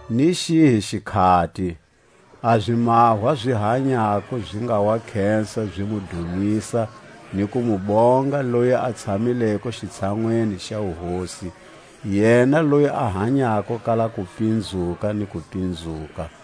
Ni xihi xikhati a zimahwa zi hanyako zi nga wa khesa zi mu dumisa ni ku mu bonga loyi a tshamileko xitshanwini xa wuhosi, yena loyi a hanyako kala kupinzuka ni kupinzuka,